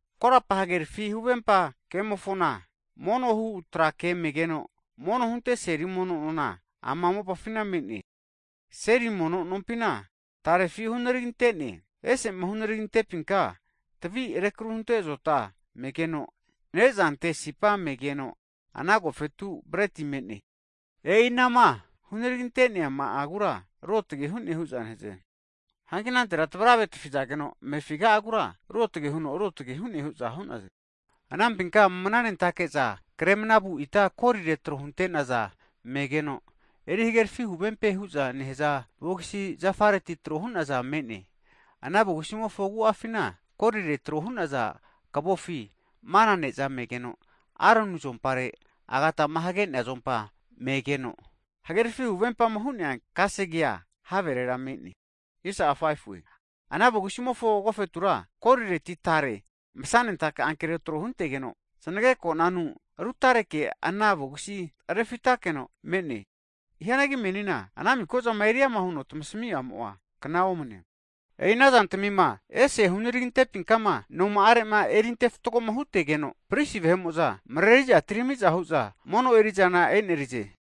Korapa hagerafi huvempa kemofona mono hu trake'a megeno mono hunte seri mono nona ama mopafina me'ne. Seri mono nompina tarefi hunaragintene. Ese'ma hunaragintepinka tavima rekru hunte azota megeno, nezante sipa megeno ana agofetura breti me'ne. E'i anama hunaragi ante'neama'agura ruotge hu'ne hu'za nehaze. Hagi anantera tavrave tafizageno amefiga'agura ruotage huno ruotge hu'ne hu'za hu'naze. Anampinka mananentake'za kre manavu ita korire tro huntenaza megeno, erihagerefi huvempe ke hu'za nehazaza vogisi zafareti trohu'naza me'ne. Ana vogisimofona agu'afina korire trohunaza kavofi mana neza megeno, Aroni azompare agatama hagenea megeno, hagerafi huvempama hu'nea kasegea haverera me'ne. Ana vogisimofo agofetura kumimofo nona huno apasezane, korireti tare masanentake ankero tro huntegeno, znagekonanu rutareke ana vogisia refitakeno me'ne. Hianagi menina ana miko'zamofo agafa'a eri ama osugahue. E'i anazantamima ese hunaragintepima noma'arema eriante fatgoma hutegeno, prisi vahe'mo'za mareriza atiramiza hu'za mono eri'zana e'nerize.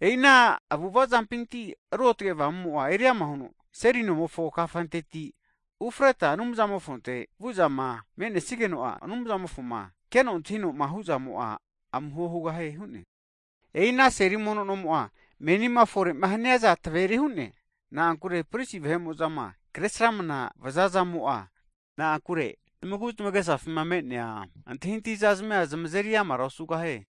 E'i ana avu'avazampinti Ruotge Avamumo'a eriama huno seri nomofo kafanteti ufreta Anumzamofonte vu'zama me'nesigeno'a Anumzamofoma keno antahinoma hu'zamo'a amuho hugahie hu'ne. E'i ana seri mono nomo'a menima fore'ma haniaza taveri hu'ne. Na'ankure prisi vahe'mo'zama kre sramanama vazazamo'a zamagu zmagesafima me'nea antahintahizazmia zmazeri amara osugahie.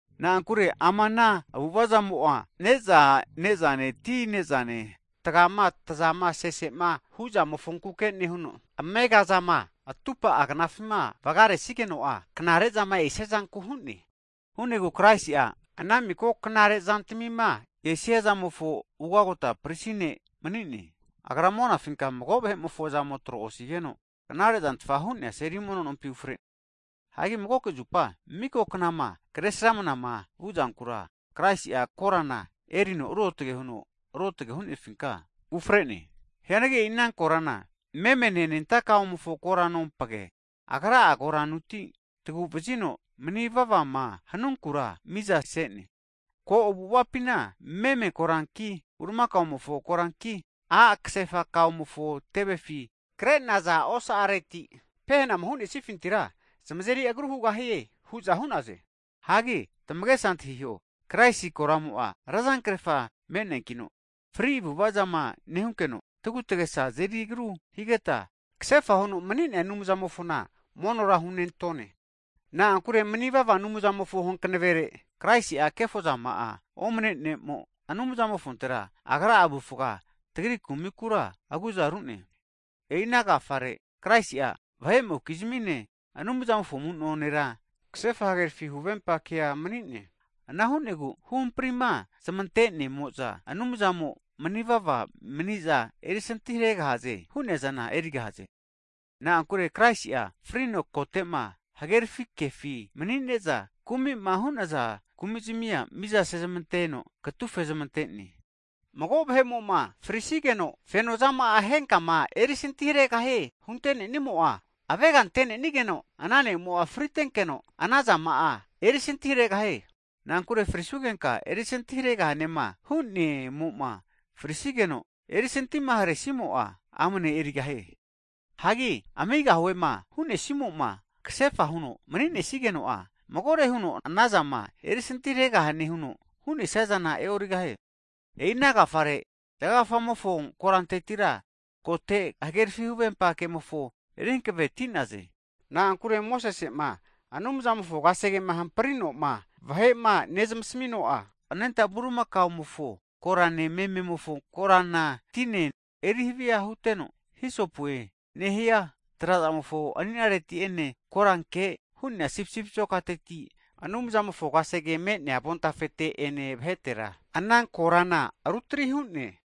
Na'ankure ama ana avu'avazamo'a ne'za nezane ti nezane, tagiama tazama sesema huzamofonkuke nehuno, amegazama atupa'a knafima vgaresigeno'a, knarezama esiazanku hu'ne. Hu'negu Kraisi'a ana miko knare zantamima esiazamofo Ugagota Prisi Ne' mani'ne. Agra monafinka mago vahe'mofo azamo tro osigeno, knarezantfa hu'nea seri nompi ufrene. Hagi magoke zupa miko knama kresramnama vuzankura Kraisi'a korana erino ruotge huno ruotge hu'nefinka ufrene. Hianagi e'i ana korana memene anenta kaomofo koranompage, Agra'a koranuti tagu'vazino mni vavama hanunkura miza sene. Ko avu'avapina meme koranki, bulimakamofo koranki a' kasefa kaomofo tevefi krenaza osa'areti, pehenama hu'nesafintira zamazeri agru hugahie hu'za hu'naze. Hagi tamagesa antahiho, Kraisi koramo'a razankrefa me'neankino, fri avu'avazama nehunkeno tagutagesa azeri agru higeta, kasefa huno mni'nea Anumzamofona monora hunentone. Na'ankure manivava Avamumofo hankavere, Kraisi'a kefozama'a omne ne'mo, Anumzamofontera Agra'a avufga tagri kumikura aguza rune. E'i ana agafare Kraisi'a vahe'mokizmine Anumzamofo amu'no nera kasefa hagerafi huvempa kea mani'ne. Ana hu'negu huhamprima zmantene'mo'za vahe'mo'za Anumzamo manivava maniza erisinti haregahaze hu'neazana erigahaze. Na'ankure Kraisi'a frino, kotema hagerafi kefi manine'za kumima hu'nazana kumizmia mizasezmanteno katufe zmante'ne. Mago vahe'mo'ma frisigeno fenozama'ama henkama erisinti haregahie huntenenimo'a, avegante'nenigeno ana nemo'a fritenkeno, ana zama'a erisinti haregahie. Na'ankure frisugenka erisanti haregahane hu'ne'mo'ma frisigeno, erisantima haresimo'a amne erigahie. Hagi amigahuema hunesimoma kasefa huno maninesigeno'a, magore huno anazama erisanti haregahane huno hunesizana e'origahie. E'i ana agafare zgagafamofo korantetira kote hagerafi huvempa kemofo eri hanaveti'naze. Na'ankure Mosesema Anumzamofo kasegema hamprinoma vahema nezamasino'a, anenta bulimakaomofo korane mememofo korana tine eri hava huteno, erino hisopue nehia trazamofo aninareti'ene koranke hu'nea sipisipi azokateti Anumzamofo kasege me'nea avontafete ene vahetera, ana korana rutari hu'ne.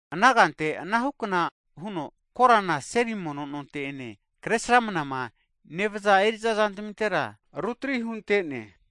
Ana kanteke, anahukna huno korana seri mono nonte'ene kresramnama nevaza eriza zantamintera rutri huntene.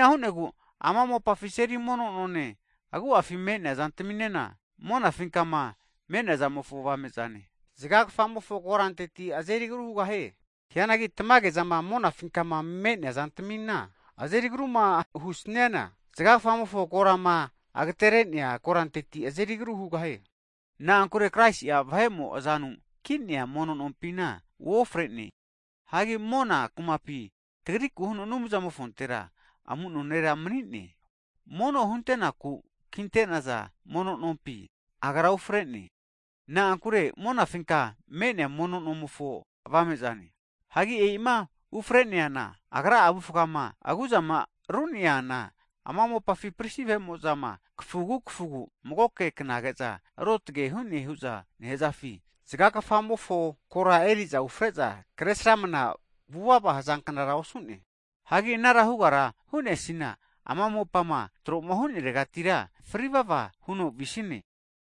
E'ina hu'negu ama mopafi seli mono none agu'afima me'nea zantaminena, monafinkama me'neazamofo avamezane, zga kfamofo koranteti azeri agru hugahie. Hianagi tamage zama monafinkama me'nea zantamina azeri agruma husniana, zga kfamofo korama ageterenea koranteti azeri agru hugahie. Na'ankure Kraisi'a vahe'mo azanu ki'nea mono nompina uofrene. Hagi mona kumapi tagriku huno Anumzamofontera amuno nera mani'ne. Mono hunte'naku kintenaza mono nompi Agra uofre'ne. Na'ankure monafinka me'nea mono nomofo avame'zane. Hagi e'ima ufreneana, Agra'a avufgama aguzama ru'neana, ama mopafi prisi vahe'mo'zama kafugu kafugu magoke knage'za ruotge hune hu'za nehazafi, zga kfamofo kora eri'za ufre'za kresramana vuvava hazanknara osu'ne. Hanki anara hugara hu'nesiana, ama mopama troma huneregatira fri vava huno visine.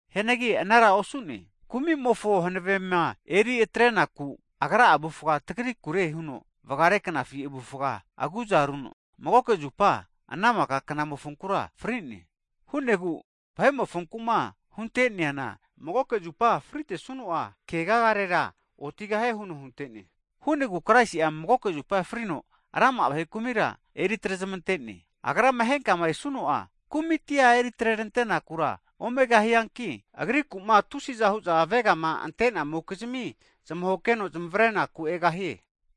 Hianagi anara osu'ne. Kumi'mofo hanavema eri atrenaku, Agra'a avufga tagrikure huno vgare knafi avufga agu'za runo magoke zupa, ana maka knamofonkura fri'ne. Hu'negu vahe'mofonku'ma hunteneana, magoke zupa fritesuno'a kegagarera otigahie huno huntene. Hu'negu Kraisi'a magoke zupa frino rama'a vahe kumira eritrezamtene. Agrama henkama esu'no'a kumiti eritrerante'nakura omegahianki, Agriku'ma tusiza hu'za avegama ante'namokizmi zmahokeno zmavrenaku egahie.